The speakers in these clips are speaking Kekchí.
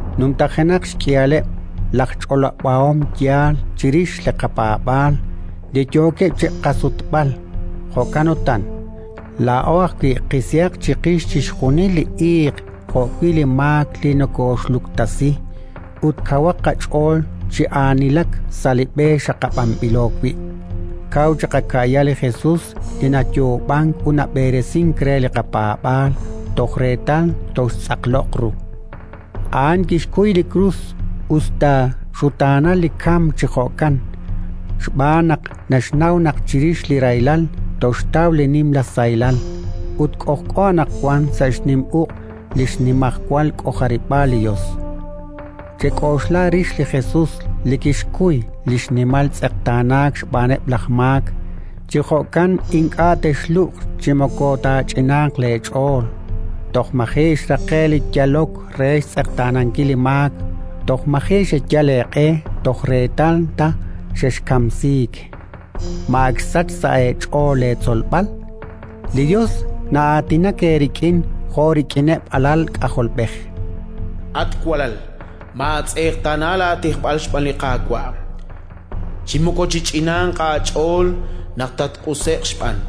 Numtajenaq xk'ihaleb' laj ch'olob'ahom yaal chirix li qapaab'aal li yookeb' chi qasutb'al! Jo'kan utan, laa'o ajwi' qisihaq chiqix chixjunil li iiq jo'wi' li maak li nokooxluktasi, ut kawaq qach'ool chi aanilak sa' li b'e xaqab'anb'ilo wi'. Kaw chiqaka'ya li Jesus li nayoob'ank ut nab'eresink re li qapaab'aal toj reetal toxtz'aqloq ru. A'an kixkuy li krus, us ta xutaanal li kamk chi jo'kan, xb'aan naq naxnaw naq chirix li rahilal toxtaw nimla sahilal. Ut k'ojk'o anaqwan sa' xnim uq' li xnimajwal k'ojarib'aal li Yos. Chek'oxla rix li Jesus li kixkuy xnimal tz'eqtaanaak xb'aaneb' laj maak; chi jo'kan ink'a' texlub'q chi moko taach'inanq leech'ool. Toj maji' xraqe'k li yalok re xtz'eqtaanankil li maak; toj maji' xeyal eeq'e toj reetal ta xexkamsiik. Ma ak xsachk sa' eech'ool leetzolb'al? Li Yos na'aatinak eerik'in jo' rik'ineb' alal k'ajolb'ej: “At walal, maatz'eqtaana laatijb'al xb'aan li Qaawa', chi moko chich'inanq aach'ool naq tatq'use'q xb'aan.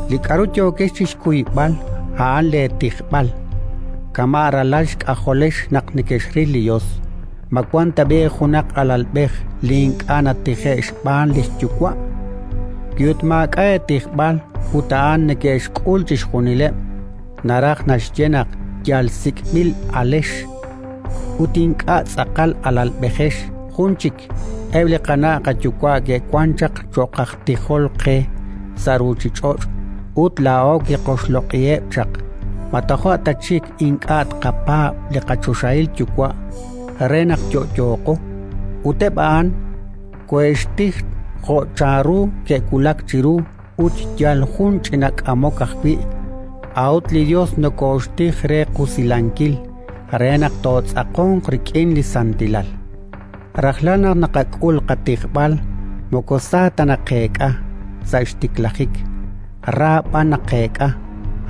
Li k'aru yookex chi xkuyb'al a'an leetijb'al. Kama' ralal xk'ajolex naq nekexril li Yos. Ma wank tab'i' junaq alalb'ej li ink'a' natije'k xb'aan li xyuwa'? Wi ut maak'a' eetijb'al (ut a'an neke'xk'ul chixjunileb'), naraj naxye naq yal sik'b'il alex ut ink'a' tz'aqal alalb'ejex. Jun chik. Eb' li qana' qayuwa' ke'wank chaq cho'q aj tijol qe sa' ruuchich'och', ut laa'o kiqoxloq'iheb' chaq. Ma toja' ta chik ink'a' tqapaab' li qachoxahil Yuwa', re naq yo'yooqo? Ut eb' a'an koohe'xtij jo' chanru ke'wulak chiru ut yal jun ch'ina k'amok ajwi'; a'ut li Yos nokooxtij re qusilankil, re naq tootz'aqonq rik'in li xsantilal. Rajlal naq naqak'ul qatijb'al moko sa ta naqeek'a sa' xtiklajik, ra b'an naqeek'a;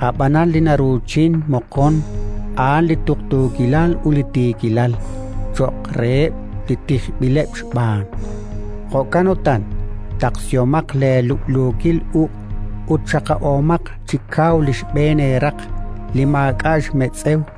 ab'anan li naruuchin moqon, a'an li tuqtuukilal ut tiikilal cho'q reheb' li tijb'ileb' xb'aan. Jo'kan utan, taqsihomaq leelub'luukil uq' ut xaqab'omaq chi kaw li xb'een eeraq li maak'a' xmetz'ew;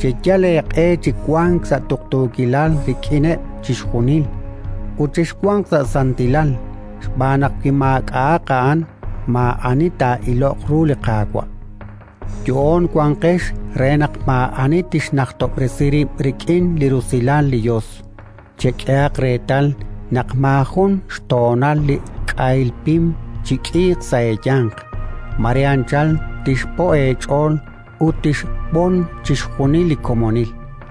Cheyalaq eeq'e chi wank sa' tuqtuukilal rik'ineb' chixjunil, ut chexwanq sa' santilal, xb'aan naq wi maak'a'aq a'an, maa'ani taa'iloq ru li Qaawa'. Yo'oon wanqex re naq maa'ani tixnajtob'resi rib' rik'in li rusilal li Yos. Chek'ehaq reetal naq maajun xtoonal li k'ahil pim chik'iiq sa' eeyanq: mare anchal tixpo' eech'ool ut tixb'on chixjunil li komonil.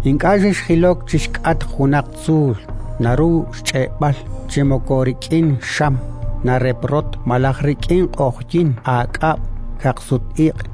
Ink'a' xexjilok chi xk'atq junaq tzuul naru xch'e'b'al, chi moko rik'in xam nareprotk, malaj rik'in q'oqyink, aak'ab', kaqsut-iq',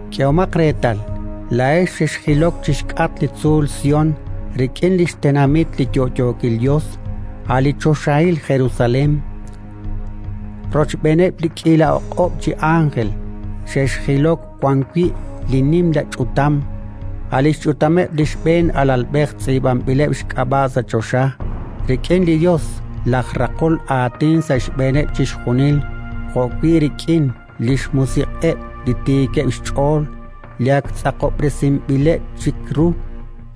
K'ehomaq reetal, laa'ex xexjilok chi xk'atq li tzuul Sión, rik'in li xtenamit li yo'yookil Yos, a' li choxahil Jerusalén, rochb'een li k'iila o'q'ob' chi ánjel; xexjilok wan wi' li nimla ch'utam, a' li xch'utameb' li xb'een alalb'ej tz'iib'anb'ileb' xk'ab'a' sa' choxa, rik'in li Yos laj raqol aatin sa' xb'eeneb' chixjunil, jo'wi' rik'in li xmusiq'eb' li tiikeb' xch'ool li ak tz'aqob'resinb'ileb' chik ru.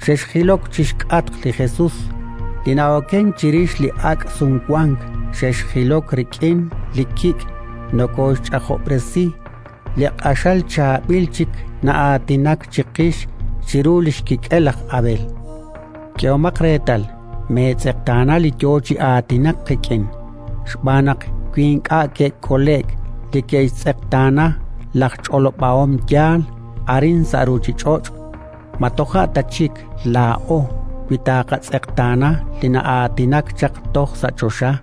Xexjilok chi xk'atq li Jesus, li na'okenk chirix li ak' Sumwank; xexjilok rik'in li kik' nokooxch'ajob'resi, li q'axal chaab'il chik na'aatinak chiqix chiru li xkik'el laj Abel. K'ehomaq reetal, meetz'eqtaana li yo chi aatinak qik'in, xb'aan naq wi ink'a' ke'kole'k li ke'xtz'eqtaana laj ch'olob'ahom yaal arin sa' ruuchich'och', ma toja' ta chik laa'o wi taaqatz'eqtaana li na'aatinak chaq toj sa' choxa?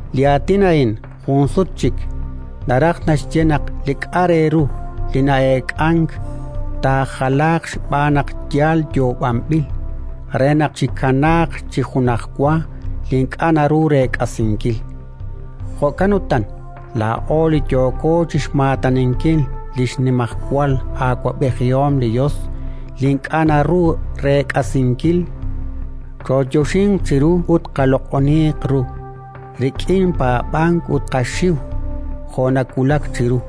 Li aatin a'in: “jun sut chik”, naraj naxye naq li k'a'aq re ru li na'eek'ank, taajalaaq (xb'aan naq yal yoob'anb'il), re naq chikanaaq chi junajwa li ink'a' naru reek'asinkil. Jo'kan utan, laa'o li yooko chi xmaataninkil li xnimajwal awab'ejihom li Yos li ink'a' naru reek'asinkil, chooyoxinq chiru ut qaloq'oniiq ru rik'in paab'ank ut qaxiw, jo' nawulak chiru,